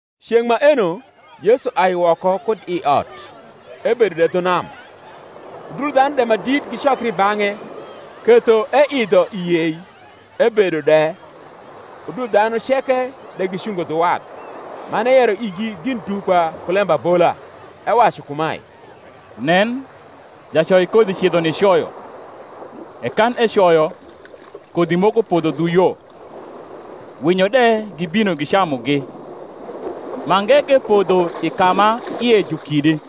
Ceng’ maeno Yesu ai woko kud i ot, ebedo de dhu nam. Udul dhanu de ma dit gicokri i bang’e, ketho eidho i yei, ebedo de; udul dhanu ceke de gicungo dhu wath. Man eyero igi gin dupa ku lembabola, ewacu kumae, Nen, jacoikodhi cidho nicoyo; e kan ecoyo, kodhi moko podho dhu yo, winyo de gibino gicamugi: mange ke podho i ka ma ie ju kidi,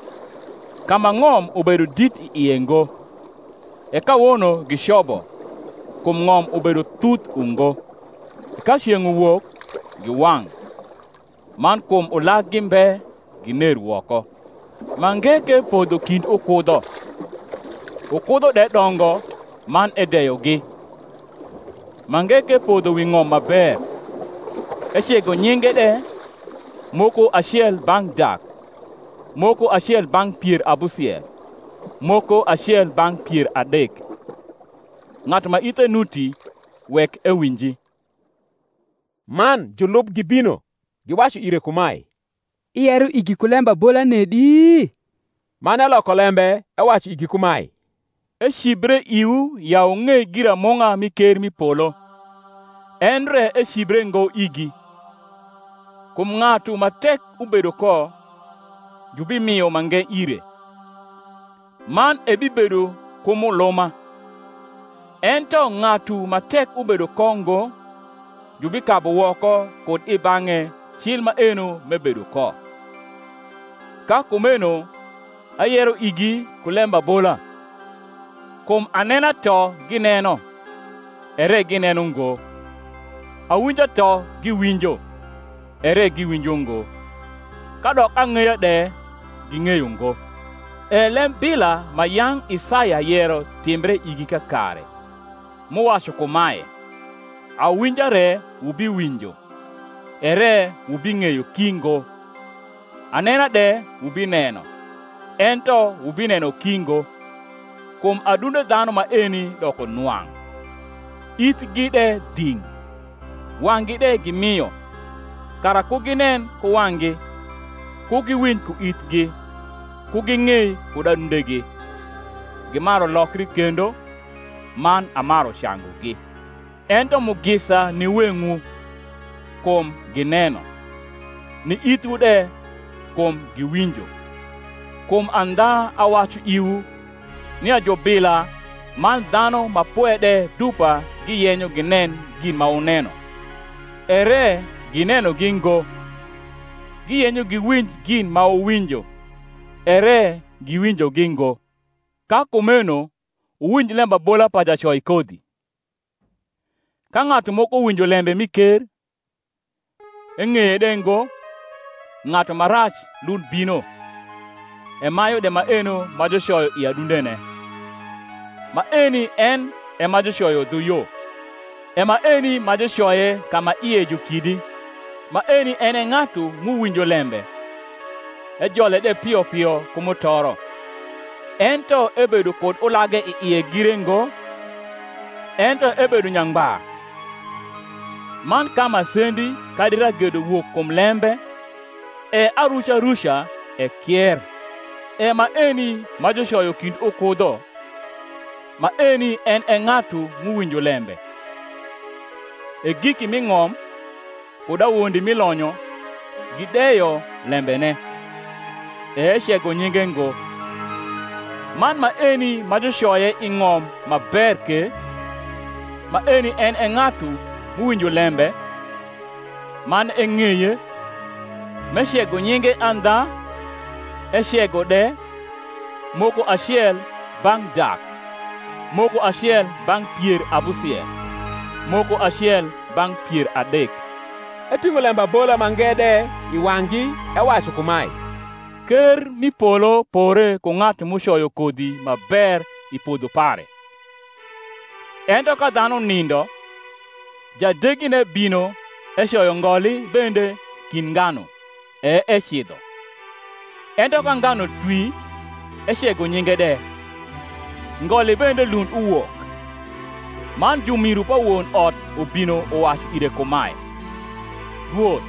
ka ma ng’om ubedo dit i ie ngo: e kawono gicobo, kum ng’om ubedo thuth ungo: e ka ceng’ uwok, giwang’; man kum ulaggi mbe, giner woko. Mange ke podho kind ukudho; ukudho de dongo man edeyogi: mange ke podho wi ng’om ma ber, ecego nyinge de, moko acel bang’ dak, moko acel bang’ pier abusiel, moko acel bang’ pier adek. Ng’atu ma ithe nuti, wek ewinji. Man julub gibino, giwacu ire kumae, Iyero igi ku lembabola nedi? Man eloko lembe ewacu igi kumae, Ecibre iwu ya wung’ei giramung’a mi ker m’i polo, endre ecibre ngo igi. Kum ng’atu ma tek ubedo ko, jubimio mange ire, man ebibedo ku muluma: ento ng’atu ma tek ubedo ko ngo, jubikabu woko kud i bang’e cil maeno m’ebedo ko. Ka kumeno ayero igi ku lembabola: kum anena to gineno ere gineno ngo, awinja to giwinjo ere giwinjo ngo, kadok ang’eya de ging’eyo ngo. E lembila ma yang’ Isaya yero timbre igi kakare, m’uwacu kumae, Awinja re wubiwinjo, ere wubing’eyo ki ngo; Anena de wubineno, ento wubineno ki ngo: Kum adunde dhanu maeni doko nwang’, Ithgi de dhing’, Wang’gi de gimio; Kara ku ginen ku wang’gi, Ku giwinj ku ithgi, Ku ging’ei kud adundegi, Gimaru lokri kendo, Man amaru cangugi. Ento mugisa ni weng’wu, kum gineno; ni ithwu de, kum giwinjo. Kum andha awacu iwu, nia jubila man dhanu ma pwe de dupa giyenyo ginen gin ma wuneno, ere ginenogi ngo; giyenyo giwinj gin ma wuwinjo, ere giwinjogi ngo. Ka kumeno wuwinj lembabola pa jacoikodhi. Ka ng’atu moko winjo lembe mi ker, eng’eye de ngo, ng’atu ma rac lund bino, emayu de maeno ma jucoyo i adundene. Maeni en e ma jucoyo dhu yo. E maeni ma jucoye ka ma ie ju kidi, maeni en e ng’atu m’uwinjo lembe, ejole de pio pio ku mutoro; ento ebedo kud ulage i ie gire ngo, ento ebedo nyangba; man ka masendi kadi ragedo wok kum lembe, e aruca ruca ekier. E maeni ma jucoyo kind ukudho, maeni en e ng’atu m’uwinjo lembe; e giki m’i ng’om, kud awondi mi lonyo, gideyo lembene, e ecego nyinge ngo. Man maeni ma jucoye i ng’om ma ber ke, maeni en e ng’atu m’uwinjo lembe, man eng’eye; m’ecego nyinge andha, ecego de, moko acel bang’ dak, moko acel bang’ pier abusiel, moko acel bang’ pier adek. Eting’o lembabola mange de i wang’gi ewacu kumae, Ker m’i polo pore ku ng’atu m’ucoyo kodhi ma ber i podho pare: ento ka dhanu nindo, jadegine bino ecoyo ngoli bende kind nganu, e ecidho. Ento ka nganu twi ecego nyinge de, ngoli bende lund uwok. Man jumiru pa won ot ubino uwacu ire kumae, Rwoth,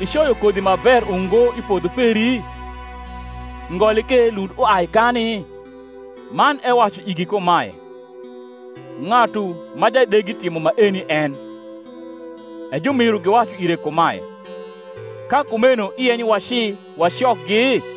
icoyo kodhi ma ber ungo i podho peri? ngoli ke lund uai kani? Man ewacu igi kumae, Ng’atu ma jadegi timo maeni en. E jumiru giwacu ire kumae, Ka kumeno iyenyo waci wacokgi?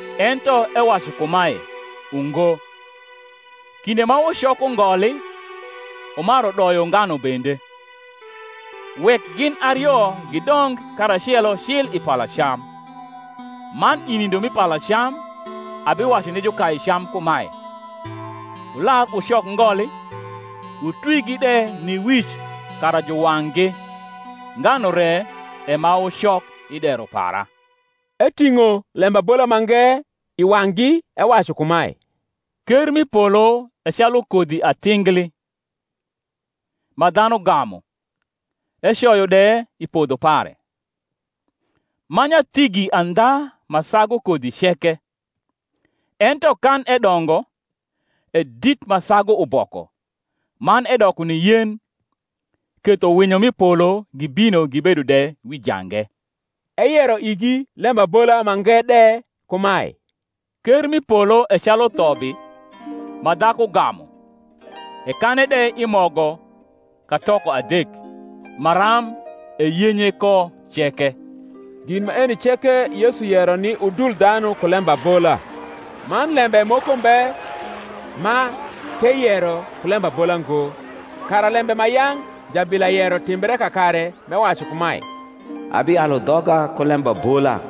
Ento ewacu kumae, Ungo; kinde ma wucoko ngoli, wumaru doyo nganu bende. Wek gin ario gidong karacelo cil i palacam: man i nindo mi palacam abiwacu ni jukaicam kumae, Wular wucok ngoli, wutwigi de ni wic kara juwang’gi; nganu re e ma wucok i dero para. Eting’o lembabola mange i wang’gi, ewacu kumae, Ker m’i polo e calu kodhi atingli, ma dhanu gamu, ecoyo de i podho pare: ma nyathigi andha ma sagu kodhi ceke: ento kan edongo, e dit ma sagu uboko, man edoko ni yen, ketho winyo m’i polo gibino gibedo de wi jange. Eyero igi lembabola mange de kumae; Ker m’i polo e calu thobi, ma dhaku gamu, ekane de i mogo katoko adek, maram eyenye ko ceke. Gin maeni ceke Yesu yero ni udul dhanu ku lembabola; man lembe moko mbe ma k’eyero ku lembabola ngo: kara lembe ma yang’ jabila yero timbre kakare, m’ewacu kumae, Abialu dhoga ku lembabola;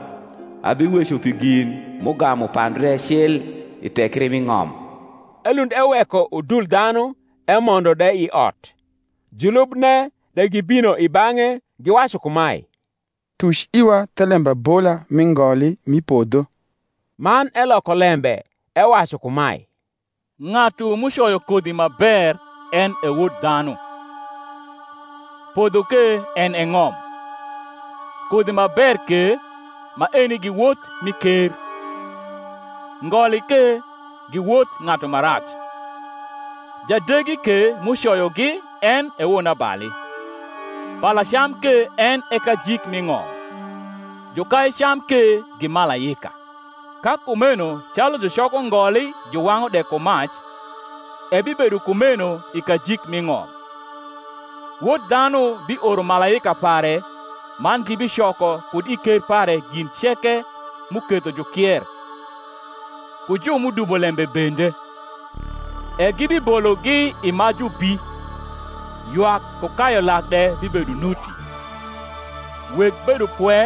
Abiweco pi gin m’ugamu pandre cil i thekri mi ng’om. Elund eweko udul dhanu emondo de i ot: julubne de gibino i bang’e, giwacu kumae, Tuc iwa the lembabola mi ngoli mi podho. Man eloko lembe ewacu kumae, Ng’atu m’ucoyo kodhi ma ber en e Wod dhanu; podho ke en e ng’om; kodhi ma ber ke, maeni gi wot mi ker: ngoli ke gi wot ng’atu ma rac; jadegi ke m’ucoyogi en e wonabali: palacam ke en e kajik mi ng’om; jukaicam ke gi malaika. Ka kumeno calu jucoko ngoli juwang’u de ku mac; ebibedo kumeno i kajik mi ng’om. Wod dhanu bioro malaika pare man gibicoko kud i ker pare gin ceke m’uketho jukier, ku ju m’udubo lembe bende, e gibibologi i majubi: ywak ku kayu lak de bibedo nuti. Weg bedopwe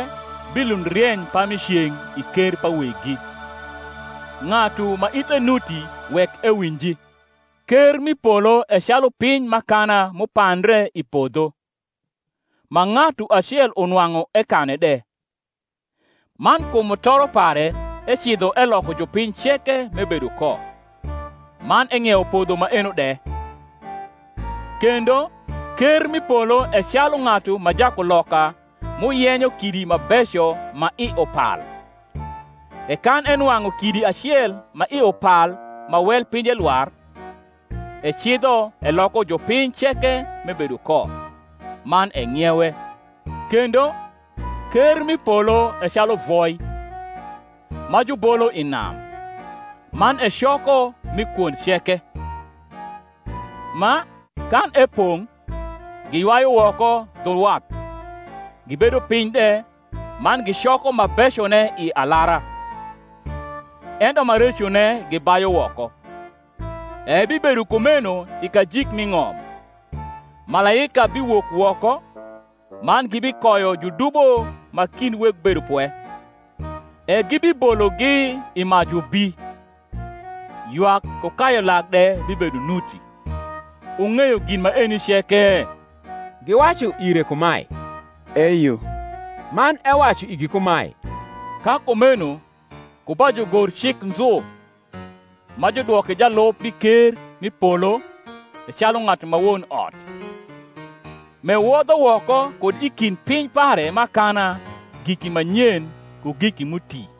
bilund rieny pami ceng’ i ker pa Weggi. Ng’atu ma ithe nuti wek ewinji. Ker m’i polo e calu piny m’akana m’upandre i podho: ma ng’atu acel unwang’u ekane de; man kum mutoro pare ecidho eloko jupiny ceke m’ebedo ko, man eng’iewo podho maeno de. Kendo, ker m’i polo e calu ng’atu ma jakuloka m’uyenyo kidi ma beco ma i upal: e kan enwang’u kidi acel ma i upal ma wel pinje lwar, ecidho eloko jupiny ceke m’ebedo ko, man eng’iewe. Kendo, ker m’i polo e calu voi, ma jubolo i nam, man ecoko mi kwond ceke: ma, kan epong’, giywayu woko dhu wath; gibedo piny de, man gicoko ma becone i alara, ento ma recone gibayu woko. E ebibedo kumeno i kajik mi ng’om: malaika biwok woko, man gibikoyo judubo ma kind weg bedopwe, e gibibologi i majubi: ywak ku kayu lak de bibedo nuti. Wung’eyo gin maeni ceke? Giwacu ire kumae, Eyo. Man ewacu igi kumae, Ka kumeno ku ba jugorcik nzu ma judwoke jalub mi ker m’i polo e calu ng’atu ma won ot, m’ewodho woko kud i kind piny pare m’akana giki ma nyen ku giki m’uti.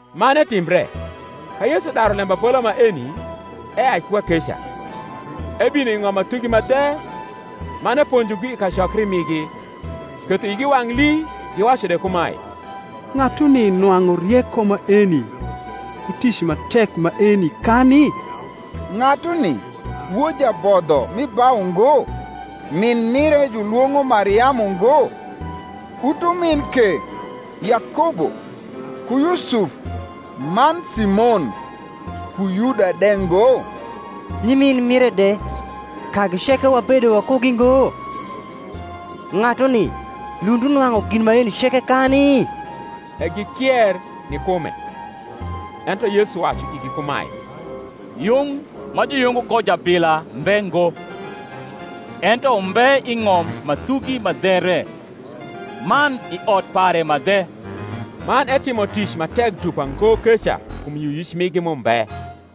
Man etimbre, ka Yesu daru lembabola maeni, eai ku kakeca. Ebino i ng’om ma thugi ma dhe man eponjogi i kacokri rnigi, ketho igi wang’ lii, giwacu de kumae, Ng’atuni nwang’u rieko maeni, ku tic ma tek maeni kani? Ng’atuni wod jabodho mi bau ngo? min mire julwong’o Mariamu ngo? utumin ke, Yakobo, ku Yusuf, man Simon, ku Yuda de ngo? Nyimin mire de, kagi ceke wabedo wakugi ngo? Ng’atuni lund unwang’u gin maeni ceke kani? E gikier ni kume. Ento Yesu wacu igi kumae, Yung ma juyungo ko jabila mbe ngo, ento umbe i ng’om ma thugi ma dhe re, man i ot pare ma dhe. Man etimo tic ma tek dupa ngo keca kum yioyic migi m’umbe.